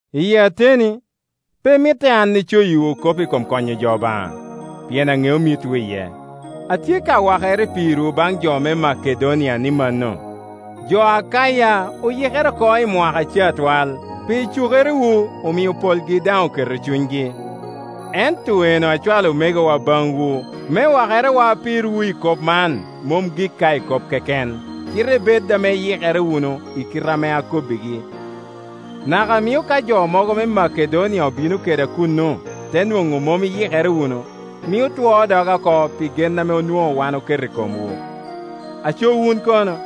Iyi ateni, pe mitte an icoyiwu kop i kom konyo jo Obaŋa, pien aŋeo mitwu iye. Atye ka wakere pirwu baŋ jo me Makedonia ni mano, “Jo Akaya oyikere oko i mwaka ca twal.” Pi cukerewu omio polgi daŋ oketo cunygi. Ento enno acwalo omegowa baŋwu me wakerewa pirwu i kop man mom gik ka i kop keken, cite ibed ame iyikere wunu i kite ame akobbigi. Naka mio ka jo mogo me Makedonia obino keda kuno te nwoŋo mom iyikere wunu, mio twoo doga oko pi gen ame onwoŋo wan oketo i komwu; aco wun kono?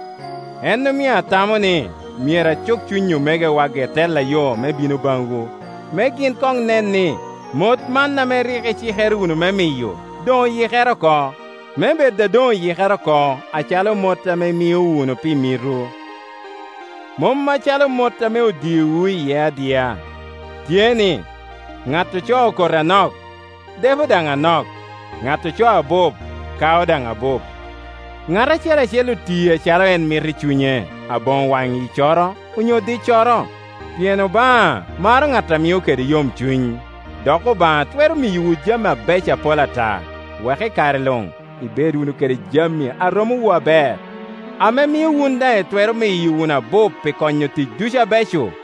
En omio atamo ni myero acuk cuny omegowa ge tella yo me bino baŋwu, me gin koŋ nen ni mot man ame rik icikere wunu me miyo doŋ oyikere oko; me bed a doŋ oyikere oko acalo mot ame imio wunu pi mitwu, mom acalo mot ame odiowu iye adia. Tye ni, ŋat ocoo koti anok, depo daŋ anok, ŋat ocoo abup kao daŋ abup. Ŋat acel acel oti acalo en mito i cunye, aboŋo wanyiccoro onyo diccoro. Pien Obaŋa maro ŋat a mio kede yomcuny. Dok Obaŋa twero miyowu jami abeco apol ata, wek i kare luŋ ibed wunu kede jami a romowu aber, ame mio wun daŋ itwero miyo wunu abup pi konyo tic ducu abeco,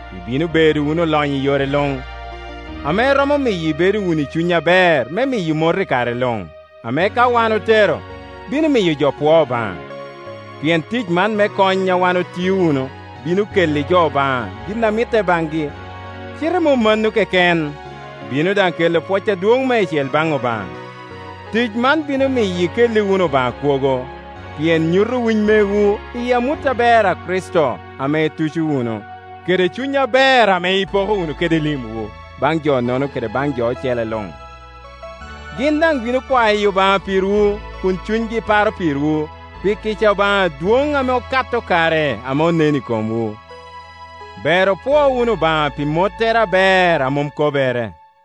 I bino bedo wunu olonyo i yore luŋ, ame romo miyo ibedo wunu i cuny aber me miyo mot i kare luŋ, ame ka wan otero, bino miyo jo pwoo Obaŋa. Pien tic man me kony a wun itio wunu bino kelli jo Obaŋa gin a mitte baŋgi, cite mom mano keken, bino daŋ kelo pwoc adwoŋ meicel baŋ Obaŋa. Tic man bino miyo ikelli wunu Obaŋa kwogo, pien nyuto winy megwu iyi amut aber a Kricito ame ituco wunu, kede cuny aber ame ipoko wunu kede limwu baŋ jo-nono kede baŋ jo ocele luŋ. Gin daŋ bino kwayo Obaŋa pirwu kun cunygi paro pirwu, pi kica Obaŋa adwoŋ ame okato kare ame onen i komwu. Ber opwo wunu Obaŋa pi mottere aber a mom kober